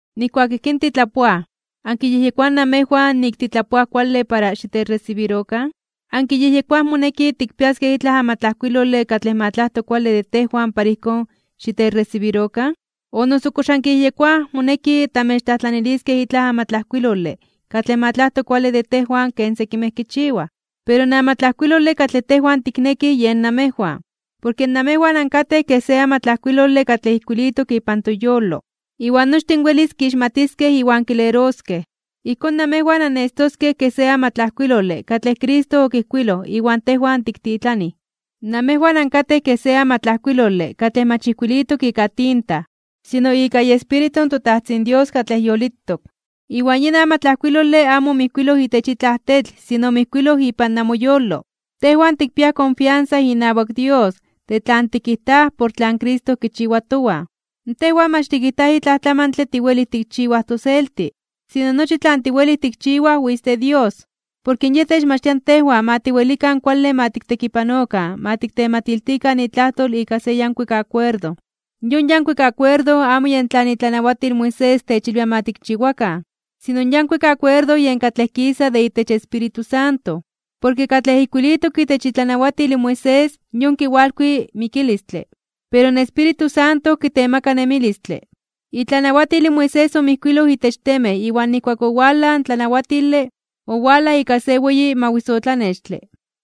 Nijkuak ijkín titlapoaj, ¿ankiyejyekoaj namejwan nik titlapoaj kuale para xitechresibirokan? ¿Ankiyejyekoaj moneki tikpiaskej itlaj amatlajkuilole katlej ma tlajto kuale de tejwan para ijkón xitechresibirokan, o noso kox ankiyejyekoaj moneki tamechtlajtlaniliskej itlaj amatlajkuilole katlej ma tlajto kuale de tejwan ken sekimej kichiwaj? Pero in amatlajkuilole katlej tejwan tiknekij yen namejwan, porke namejwan ankatej kej se amatlajkuilole katlej ijkuilitok ipan toyolo. Iwan nochtin welis kixmatiskej iwan kileroskej. Ijkón namejwan annestoskej kej se amatlajkuilole katlej Cristo okijkuiloj iwan tejwan tiktitlanij. Namejwan ankatej kej se amatlajkuilole katlej mach ijkuilitok ika tinta, sino ika iEspíritu in toTajtzin Dios katlej yolitok. Iwan yin amatlajkuilole amo omijkuiloj itech itlaj tetl sino omijkuiloj ipan namoyolo. Tejwan tikpiaj konfiansa inawak Dios de tlan tikijtaj por tlan Cristo kichiwa towan. Tejwan mach tikijtaj nik itlaj tlamantle tiwelij tikchiwaj toselti, sino nochi tlan tiwelij tikchiwaj witz de Dios. Porke Yej techmachtia tejwan ma tiwelikan kuale ma tiktekipanokan ma tiktematiltikan itlajtol ika se yankuik akuerdo. Yon yankuik akuerdo amo yen tlan itlanawatil Moisés techilwia ma tikchiwakan, sino in yankuik akuerdo yen katlej kisa de itech Espíritu Santo, porke katlej ijkuilitok itech itlanawatil Moisés yon kiwalkui mikilistle, pero in Espíritu Santo kitemaka nemilistle. Itlanawatil Moisés omijkuiloj itech temej iwan nijkuak owalaj in tlanawatile, owalaj ika se weyi mawisotlanextle,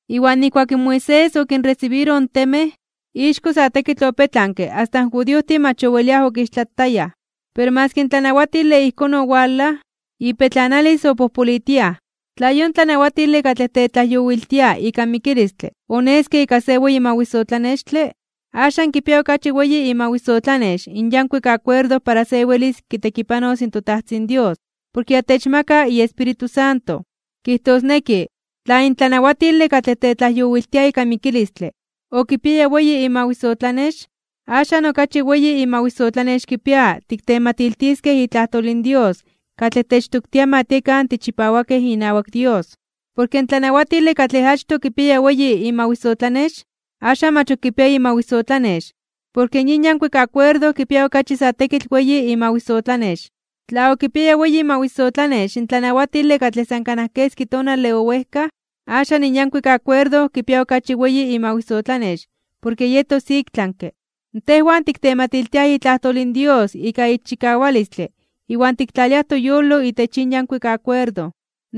iwan nijkuak in Moisés okinresibiroj in temej, ixko sa tekitl opetlanke asta in judiojtin mach oweliaj okixtlatayaj. Pero maski in tlanawatile ijkón owalaj, ipetlanilis opojpolitiaj. Tla yon tlanawatile katlej tetlajyowiltia ika mikilistle oneske ika se weyi mawisotlanextle, axan kipia okachi weyi imawisotlanex in yankuik akuerdo para se welis kitekipanos in toTajtzin Dios porke ya techmaka iEspíritu Santo. Kijtosneki tla in tlanawatile katlej tetlajyowiltia ika mikilistle okipiaya weyi imawisotlanex, axan okachi weyi imawisotlanex kipia tiktematiltiskej itlajtol in Dios katlej techtoktia ma tiekan tichipawakej inawak Dios. Porke in tlanawatile katlej achtoj okipiaya weyi imawisotlanex, axan mach ok kipia imawisotlanex, porke yin yankuik akuerdo kipia okachi sa tekitl weyi imawisotlanex. Tla okipiaya weyi imawisotlanex in tlanawatile katlej san kanaj keski tonale owejkaj, axan in yankuik akuerdo kipia okachi weyi imawisotlanex porke yetos iktlanke (ik tlami). Tejwan tiktematiltiaj itlajtol in Dios ika ixchikawalistle iwan tiktlaliaj toyolo itech yin yankuik akuerdo.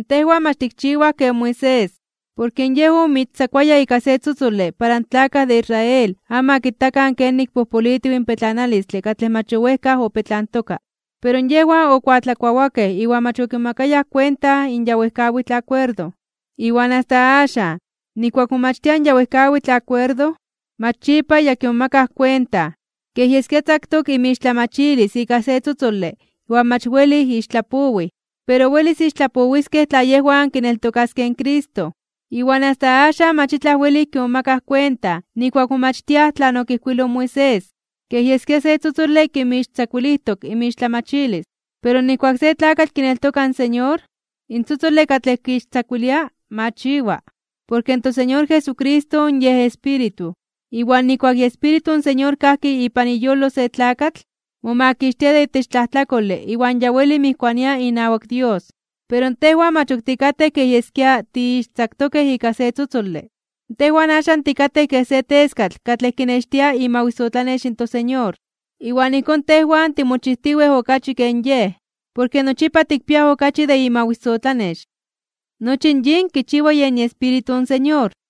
Tejwan mach tikchiwaj ken Moisés, porke yej omoixtzakuaya ika se tzotzole para in tlakaj de Israel amo ma kitakan kenik pojpolitiw in petlanalistle katlej mach owejkaj opetlantoka. Pero yejwan okuatlakuawakej iwan mach okimomakayaj kuenta in ya wejkawitl akuerdo. Iwan asta axan, nijkuak momachtiaj in ya wejkawitl akuerdo, mach yipa ya kimomakaj kuenta, kej yeskia tzaktok inmixtlamachilis ika se tzotzole iwan mach welij ixtlapowij. Pero welis ixtlajtlapowiskej tla yejwan kineltokaskej in Cristo. Iwan asta axan mach itlaj welij kimomakaj kuenta nijkuak momachtiaj tlan okijkuiloj in Moisés, kej yeskia se tzotzole kinmixtzakuilijtok inmixtlamachilis. Pero nijkuak se tlakatl kineltoka in Señor, in tzotzole katlej kixtzakuilia machiwa. Porke in toSeñor Jesucristo Yej Espíritu, iwan nijkuak iEspíritu in Señor kajki ipan iyolo se tlakatl, momakixtia de itech tlajtlakole iwan ya weli mijkuania inawak Dios. Pero tejwan mach ok tikatej kej yeskia tiixtzaktokej ika se tzotzole, tejwan axan tikatej kej se teskatl katlej kinextia imawisotlanex in toSeñor. Iwan ijkón tejwan timochijtiwej okachi ken Yej, porke nochipa tikpiaj okachi de imawisotlanex. Nochi yin kichiwa yen iEspíritu in Señor.